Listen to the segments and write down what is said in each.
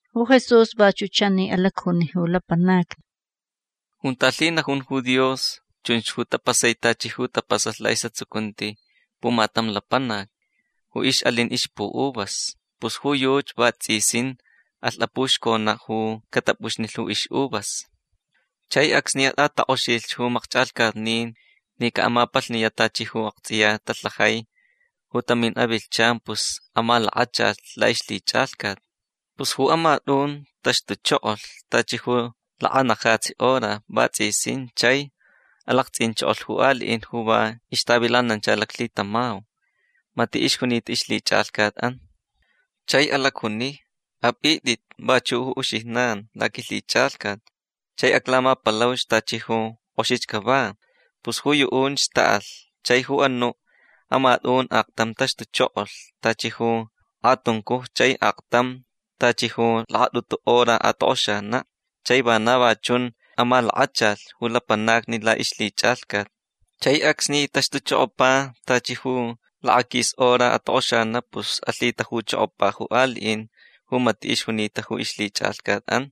Ju Jesús vachuʼ chani alacjuni ju lapanacni: ―Junta lhinajun ju Dios chunch ju tapasai tachi ju tapasalh laʼisʼatsucunti pumatam lapanac ju ixʼalin ixpuʼuvas. Pus ju yuchi vatsʼisin alh apuxconaʼ ju catapʼuxnilh ju ixʼuvas. Chai acsni atʼatakʼoxilh ju makchʼalhcatnin ni caʼamapalhniyaʼ tachi ju aktsʼiya talhajai ju tamin avilhchan pus amalakachalh laʼixlhichʼalhcat. Pus ju amatʼun taxtuchokolh tachi lakanajatsi hora vatsʼisin chai alaktsʼinchokolh ju aliʼin ju va ixtavilanancha laclhitamau. Matiʼ ixjunita ixlhichʼalhcatʼan. Chai alacjuni: “Apʼitʼit vachuʼ ju uxijnan laquilhichʼalhcat. Chai aclamapalauch tachi ju kʼoxich cava”. Pus ju yuʼunch taʼalh. Chai ju anuʼ amatʼun aktam taxtuchokolh tachi ju kʼatuncuj chai aktam tachi ju lakatʼutu hora atokʼoxanaʼ. Chai vana va chun amalakachalh ju lapanacni laʼixlhichʼalhcat. Chai acsni taxtuchokopa tachi ju lakaquis hora atokʼoxanaʼ pus alhitajuchokopa ju aliʼin ju matiʼ ixjunita ju ixlhichʼalhcatʼan.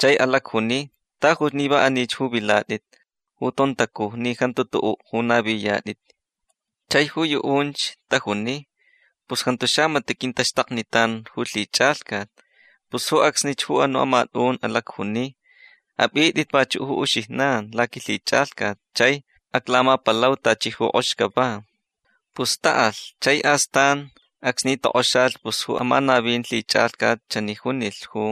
Chai alacjuni: “Tajuch ni va anich ju vilatʼit ju tontacuj ni jantu tuʼuʼ ju naviyatʼit”. Chai ju yuʼunch tajuni: “Pus jantu xamatiʼ quintaxtaknitan ju lhichʼalhcat”. Pus ju acsnich ju anuʼ amatʼun alacjuni: “Apʼitʼit vachuʼ ju uxijnan laquilhichʼalhcat. Chai aclamapalau tachi ju kʼox cava”. Pus taʼalh. Chai astan acsni tokʼoxalh pus ju amanavin lhichʼalhcat chani junilh ju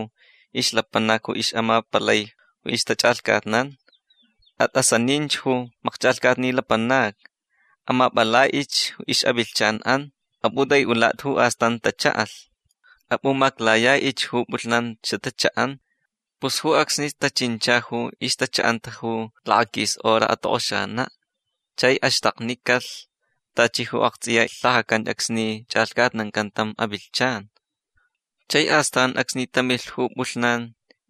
ixlapanac ju ixʼamapalai ju ixtachʼalhcatnan: “Atʼasaninch ju makchʼalhcatni lapanacni. Amapʼalhtʼich ixʼavilhchanʼan. Apʼutʼaiʼulatʼi ju astan tachaʼalh. Apʼumaclayaʼich ju pʼulhnan xatachaʼan”. Pus ju acsnich tachincha ju ixtachaʼanta ju lakaquis hora atokʼoxanaʼ chai axtaknicalh tachi ju aktsʼiya lhajacan acsni chʼalhcatnancan tam avilhchan. Chai astan acsni tamilh ju pʼulhnan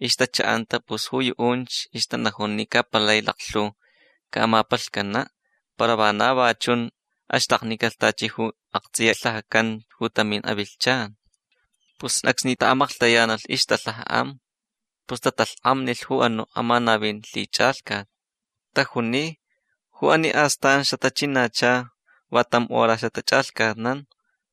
ixtachaʼanta pus ju yuʼunch ixtanajun ni ca palai laklhu camapalhcanaʼ. Para vana va chun axtaknicalh tachi ju aktsʼiya lhajacan ju tamin avilhchan. Pus acsni taʼamaklhtayanalh ixtalhajaʼan pus tatalhkʼamnilh ju anuʼ amanavin lhichʼalhcat. Tajuni: “Ju ani ju astan xatachinacha va tam hora xatachʼalhcatnan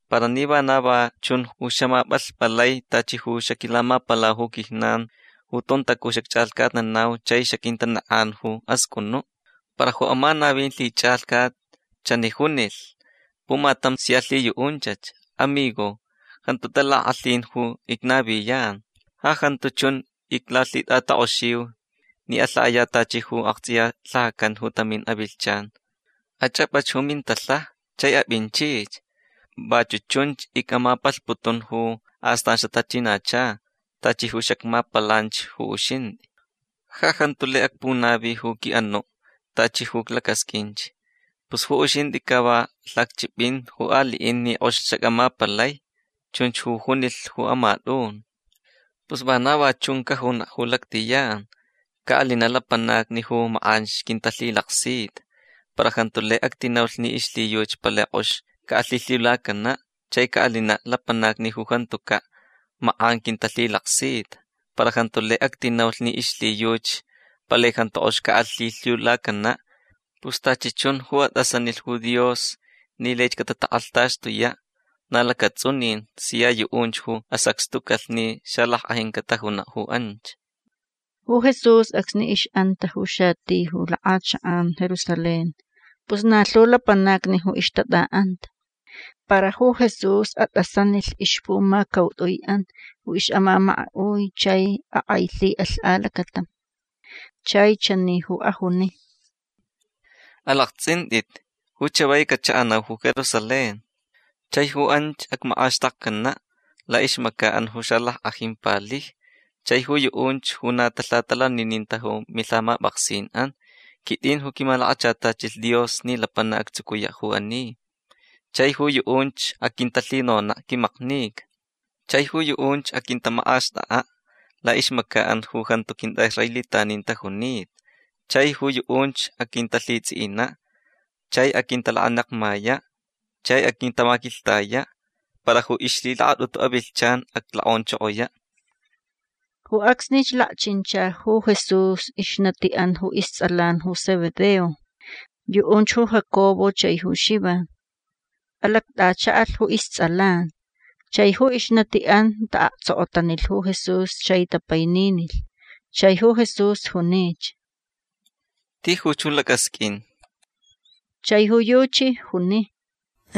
para ni vana va chun ju xaʼamapʼalhpʼalai tachi ju xaquilamapalau ju quijnan ju tontacuj xacchʼalhcatnanau chai xaquitanekʼan ju ascʼunuʼ”. Para ju amanavin lhichʼalhcat chani junilh pumatam sia lhiyuʼunchach. “Amigo. Jantu talakʼalhin ju icnaviyan. Ja jantu chun iclalhitʼakʼoxiu ni alhaʼayaʼ tachi ju aktsʼiya lhajacan ju tamin avilhchan. Achʼapʼach ju mintalhaja chai apʼinchich. Vachuʼ chun icmapalhputun ju astan xatachinacha tachi ju xacmapalanch ju uxintʼi. Ja jantu lai acpunavi ju quiʼanuʼ tachi ju iclacasqʼuinch. Pus ju uxintʼi ca va lhacchʼipʼin ju aliʼin ni kʼox xacʼamapalai”. Chunch ju junilh ju amatʼun. Pus vana va chunch cajunaʼ ju lactʼiyan. Caʼalinaʼ lapanacni ju makʼanch quintalhilaksita. Para jantu lai actinaulh ni ixlhiyuchi palai kʼox caʼalhilhiulacanaʼ. Chai caʼalinaʼ lapanacni ju jantucaʼ makʼan quintalhilaksita. Para jantu lai actinaulh ni ixlhiyuchi palai jantu kʼox caʼalhilhiulacanaʼ. Pus tachi chun ju atʼasanilh ju Dios ni laich catatakʼalhtaxtuyaʼ na lacatsʼunin sia yuʼunch ju asacxtucalh ni xalackʼajin catajunaʼ ju anch. Ju Jesús acsni ixʼanta ju xati ju lakʼachakʼan Jerusalén pus na lhu lapanacni ju ixtatʼaʼanta. Para ju Jesús atʼasanilh ixpumacautʼuiʼan ju ixʼamamakaʼui chai akʼailhiʼalh alacatam. Chai chani ju ajuni: ―Alaktsʼintʼit. Ju chavai cachaʼanau ju Jerusalén. Chai ju anch acmakʼaxtakcanaʼ laʼixmacaʼan ju xalackʼajin palijni chai ju yuʼunch ju na talhatalanininta ju milhamapʼaksinʼan. Quitʼin ju quimalakachatachilh Dios ni lapanac actsucuyaʼ ju ani. Chai ju yuʼunch aquintalhinonaʼ quimaknica. Chai ju yuʼunch aquintamakʼaxtʼakʼaʼ laʼixmacaʼan ju jantu quintʼaʼisraelitanin tajunita. Chai ju yuʼunch aquintalhitsʼiʼinaʼ. Chai aquintalakanekmayaʼ. Chai aquintamaquilhtayaʼ. Para ju ixlhilakatʼutu avilhchan aclokʼonchokoyaʼ. Ju acsnich lakchincha ju Jesús ixnatiʼan ju istsʼalan ju Zebedeo. Yuʼunch ju Jacobo chai ju Xivan. Alactʼachaʼalh ju istsʼalan. Chai ju ixnatiʼan taʼaktsokotanilh ju Jesús chai tapaininilh. Chai ju Jesús junich: ―Tijuch ju lacʼasqʼuin. Chai ju yuchi juni: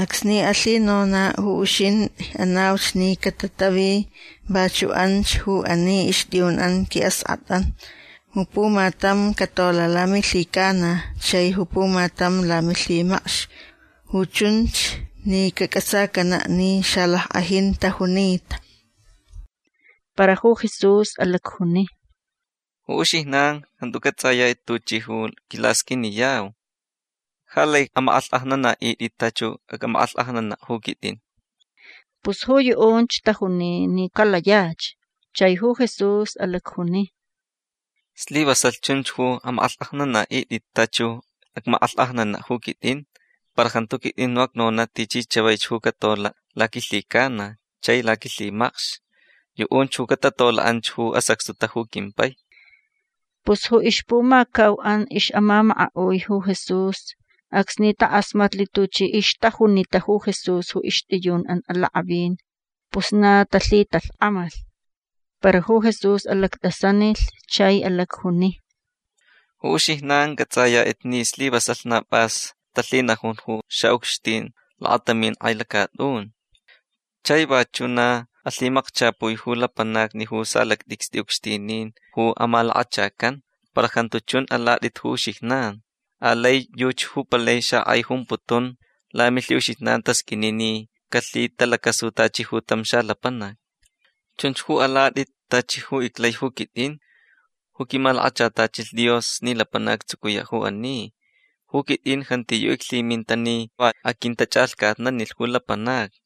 ―Acsni alhinonaʼ ju uxintʼi anauch ni catatavi vachuʼ anch ju ani ixtʼiyunʼan quiʼaskʼatʼan. Ju pumatam catolaʼ lamilhicana chai ju pumatam lamilhimacx. Ju chunch ni cacʼatsacanaʼ ni xalackʼajin tajunita. Para ju Jesús alacjuni: ―Ju uxijnan jantu cʼatsʼayatʼit tuchʼi quilasqʼuiniyau. Ja lai amakʼalhkʼajnanaʼitʼit tachi ju acmakʼalhkʼajnanaʼ ju quitʼin. Pus ju yuʼunch tajuni ni calayach. Chai ju Jesús alacjuni: ―Slivasalh chunch ju amakʼalhkʼajnanaʼitʼit tachi ju acmakʼalhkʼajnanaʼ ju quitʼin. Para jantu quitʼin ju acnonaʼ tichi chavaich ju catolaʼ laquilhicana chai laquilhimacx. Yuʼunch ju catatolaʼ anch ju asacxtuta ju quimpai. Pus ju ixpumacauʼan ixʼamamakaʼui ju Jesús acsni takʼasmatlh tuchi ixtajunita ju Jesús ju ixtʼiyunʼan alakʼavin pus na talhitalhkʼamalh. Para ju Jesús alactʼasanilh chai alacjuni: ―Ju uxijnan cʼatsʼayatʼit ni slivasalh na pʼas talhinajun ju xaʼucxtin lakatamin kʼai lacatʼun. Chai vachuʼ na alhimakchapui ju lapanacni ju salactʼicstʼi ucxtinin ju amalakachacan. Para jantu chun ju alatʼit ju uxijnan. Alai yuchi ju palai xakʼai jumputun lamilhiʼuxijnan tasqʼuini ni calhitalacasu tachi ju tam xalapanac. Chunch ju alatʼit tachi ju iclai ju quitʼin ju quimalakachatachilh Dios ni lapanac actsucuyaʼ ju ani. Ju quitʼin jantiyuʼ iclhiminta ni va aquintachʼalhcatnanilh ju lapanacni.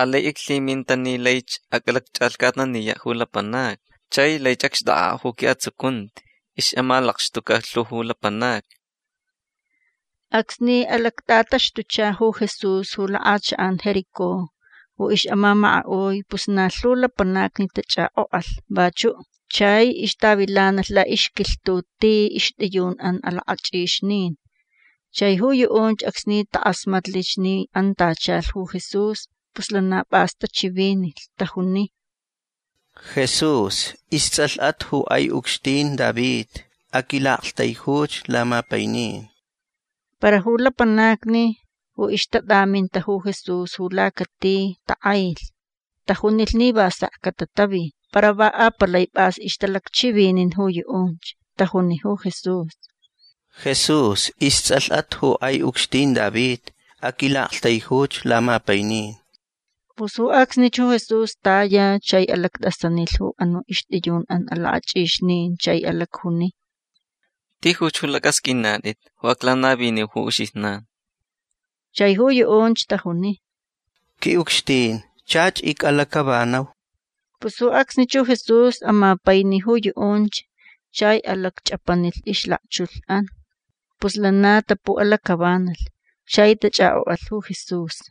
Alai iclhiminta ni laich acʼalacchʼalhcatnaniyaʼ ju lapanacni chai laich acxtʼakʼaʼ ju quiʼatsucunti ixʼamalakxtuca lhu ju lapanacni. Acsni alactʼataxtucha ju Jesús ju lakʼachakʼan Jericó ju ixʼamamakaʼui pus na lhu lapanacni tachʼakʼokʼalh vachuʼ. Chai ixtavilanalh laʼixquilhtuʼ ti ixtʼiyunʼan alakʼachʼixnin. Chai ju yuʼunch acsni takʼasmatlich ni antachalh ju Jesús pus lana pʼas tachivinilh. Tajuni: ―Jesús. Istsʼalhʼat ju kʼai ucxtin David. Aquilaʼaktaijuch lamapainin. Para ju lapanacni ju ixtatʼaminta ju Jesús ju lacati takʼailh. Tajunilh ni va sek catatavi. Para va apalai pʼas ixtalacchivinin ju yuʼunch. Tajuni ju Jesús: ―Jesús. Istsʼalhʼat ju kʼai ucxtin David. Aquilaʼaktaijuch lamapainin. Pus ju acsnich ju Jesús taya chai alactʼasanilh ju anuʼ ixtʼiyunʼan alakʼachʼixnin chai alacjuni: ―Tijuch ju lacʼasqʼuinatʼit ju aclanaviniu ju uxijnan. Chai ju yuʼunch tajuni: ―Quiʼucxtin chach icʼalacʼavanau. Pus ju acsnich ju Jesús amapaini ju yuʼunch. Chai alacchʼapanilh ixlakchulhʼan. Pus lana tapuʼalacʼavanalh chai tachʼakʼokʼalh ju Jesús.